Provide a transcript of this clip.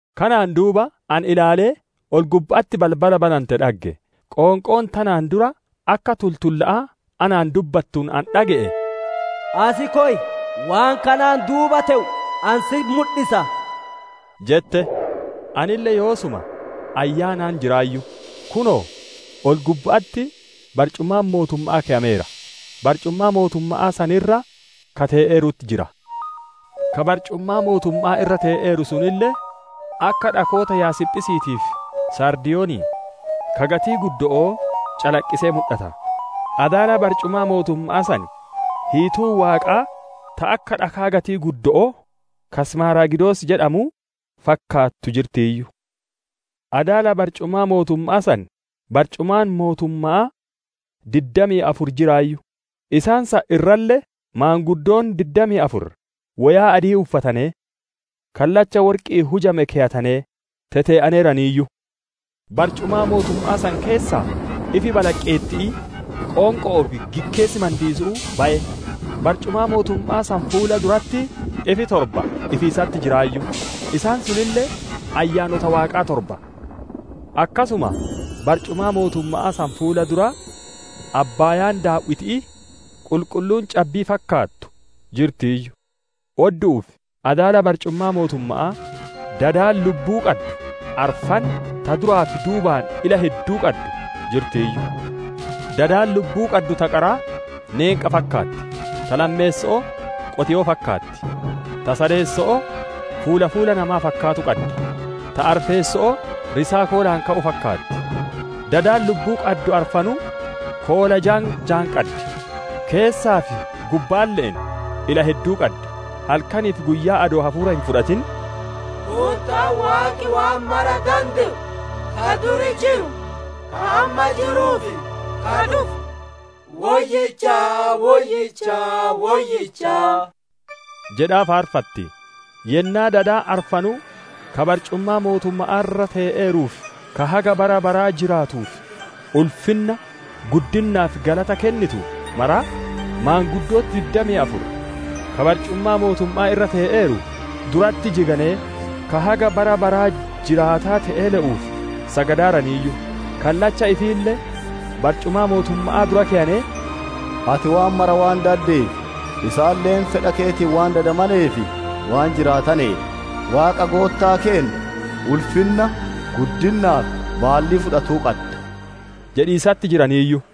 Kanaan duuba ani ilaalee, ol-gubba'atti balbala banante dhagge. Qoonqoon tanaan dura akka tultulla'aa anaan dubbattuun ani dhage'e, «Asi koy, waan kanaan duuba te'u ani sitti mudhisa!» jette. Anille yoosuma Ayyaanaan jiraayyu; kunoo, ol-gubba'atti barcumaan mootumma'aa keyameera, barcumaa mootumma'aa san irra ka tee'eerutti jira. Ka barcumaa mootumma'aa irra tee'eeru sunille, akka dhakoota Yaasiphisiitii fi Saardiyonii ka gatiin guddo'oo, calaqqisee mudhata. Adaala barcumaa mootumma'aa san hiituun Waaqaa ta akka dhakaa gatiin guddo'oo ka Simaaragidos jedhamuu fakkaattu jirtiiyyu. Adaala barcumaa mootumma'aa san, barcumaan mootumma'aa diddamii afur jiraayyu; isaan san irralle maanguddoon diddamii afur woyaa adii uffatanee, kallacha worqi'iin hujame keyatanee tetee'aneeraniiyyu. Barcumaa mootumma'aa san keessaa ifi balaqqeetti'ii, qoonqo'oo fi gikkeessi mandiisu'uu baye. Barcumaa mootumma'aa san fuula duratti ifi torba ifiisatti jiraayyu; isaan sunille Ayyaanota Waaqaa torba. Akkasuma, barcumaa mootumma'aa san fuula dura abbaayaan daaw'iti'ii, qulqulluun cabbii fakkaattu jirtiiyyu. Oddu'uu fi adaala barcumaa mootumma'aa, dadi lubbuu qaddu arfan ta duraa fi duubaan ila hedduu qaddu jirtiiyyu. Dadi lubbuu qaddu ta qaraa neenqa fakkaatti; ta lammeesso'oo qotiyyoo fakkaatti; ta sadeesso'oo fuula fuula namaa fakkaatu qaddi; ta arfeesso'oo risaa koolaan ka'u fakkaatti. Dadi lubbuu qaddu arfanuu koola jaan jaan qaddi; keessaa fi gubbaalle'een ila hedduu qaddi. Halkanii fi guyyaa adoo hafuura hin fudhatin, «Goottaan Waaqi waan mara dande'u, ka duri jiru, ka amma jiruu fi ka dhufu, Woyyicha, Woyyicha, Woyyicha!» jedhaa faarfatti. Yennaa dadi arfanuu, ka barcumaa mootumma'aa irra te'eeruu fi ka haga bara baraa jiraatuuf ulfinna, guddinna fi galata kennitu maraa, maanguddooti diddamii afur, ka barcumaa mootumma'aa irra tee'eeru duratti jiganee, ka haga bara baraa jiraataa te'e le'uuf sagadaaraniiyyu; kallacha ifiille barcumaa mootumma'aa dura keyanee, «Ati waan mara waan daddeef, isaaniille fedha keetiin waan dadamanee fi waan jiraataneef, Waaqa Goottaa keenna, ulfinna, guddinnaa fi baallii fudhatuu qadda» jedhiisatti jiraniiyyu.